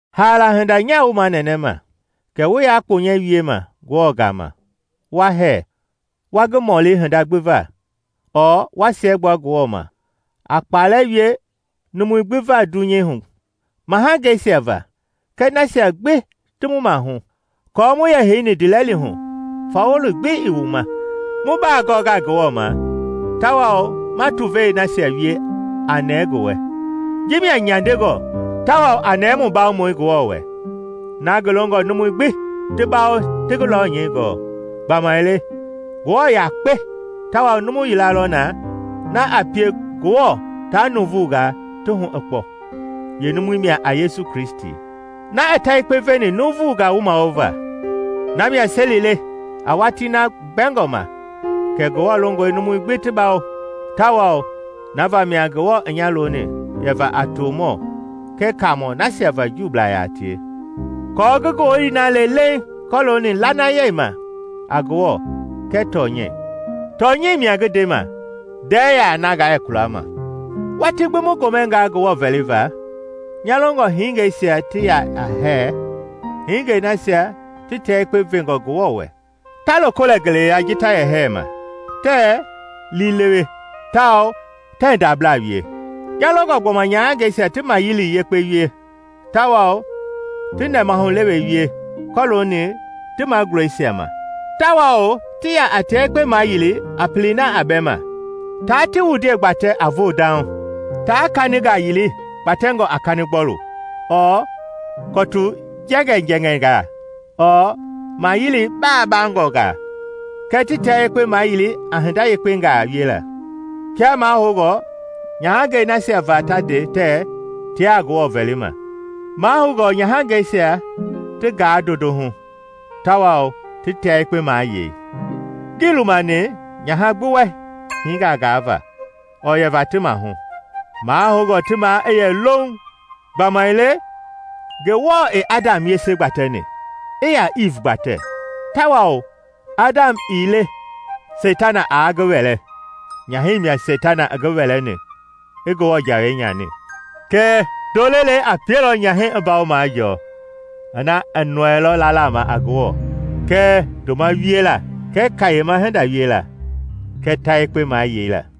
Haala hinda, nyaa wu manɛnɛma kɛ wu yaa kponyɛ wiema Ngewɔ gama wa hɛɛ, wa ngi mɔli hinda gbi va ɔɔ wa siɛgbua Ngewɔ ma, a kpɛlɛɛ wie numui gbi va dunyei hu; mahangeisia va kɛɛ nasia gbi ti mu maahu, aako mu yɛ heini ndiilɛli hu fawɔli gbi ii mu ma, mu bagɔnga Ngewɔ ma, tawao ma tuvei nasia wie a nɛɛ ngi wɛ. Ji mia nyandengɔ tawao a nɛɛ mu Bawomɔi Ngewɔ wɛ, na ngi longɔ numui gbi ti bawo ti ngi lɔnyɛi gɔɔ. Gbamaile Ngewɔ yakpe, tawao numu yila lɔ na, na a pie Ngewɔ taa nuuvungaa ti hu i kpɔ, yeenumui mia a Yesu Kristi, na i ta yekpe veni nuuvungaa wumawova. Namia seli le a watii na mbɛngɔ ma kɛ Ngewɔ longɔ numui gbi ti bawo, tawao na vamia Ngewɔ i nya loni yɛ va a tomɔ kɛɛ Kaamɔ nasia va Juublaa yaa tie, aako ngi ngowili na le leiŋ kɔlooni lanayei ma a Ngewɔ kɛɛ tɔnyɛi. Tɔnyɛi mia ngi ndema; ndɛɛ yaa na ngaa yɛ kualama Watii gbi wu gomɛngaa Ngewɔ vɛliva, nya longɔ hingeisia ti yɛ a hɛɛ, hingei nasia ti tia yekpe vengɔ Ngewɔ wɛ, ta loko lɛ ngeleya ji ta yɛ hɛɛma, tɛɛ liilewe tawao tɛɛ ndabla wie. Nya longɔ gbɔma nyahangɛisia ti mayili yekpe wie tawao ti nɛmahulewe wie kɔlooni ti magulɛisia ma, tawao ti ya a tia yekpe mayili a pelei na a bɛ ma; taa ti wundie gbatɛ a voo dauŋ, taa kaningaa yili kpatɛngɔ a kanigbɔlu ɔɔ kɔtu jɛŋɛɛjɛŋɛɛngaa ɔɔ maayili baagbangɔngaa, kɛɛ ti tia yekpe mayili a hinda yekpengaa wiela, kia mahoungɔ nyahangɛi nasia va ta nde tɛɛ tiaa Ngewɔ vɛlima. Mahoungɔ nyahangɛisia ti gaa ndondohu tawao ti tia yekpe mayei. Ngii lumani nyaha gbi wɛ hinga gaava ɔɔ yɛva ti maahu, mahoungɔ ti maa i yɛ louŋ. Gbamaile Ngewɔ i Adam yese gbatɛni i yaa Iiv gbatɛ. Tawao Adam ii le Seitana aa ngi wɛlɛ; nyahɛi mia Seitana i ngi wɛlɛni i Ngewɔ jawei nyani. Kɛɛ ndoo lelei a pielɔ nyahɛi i mbawo majɔɔ, ina i nɔɛilɔ lala ma a Ngewɔ kɛɛ ndoma wiela kɛɛ kayema hinda wiela kɛɛ ta yekpe mayeila.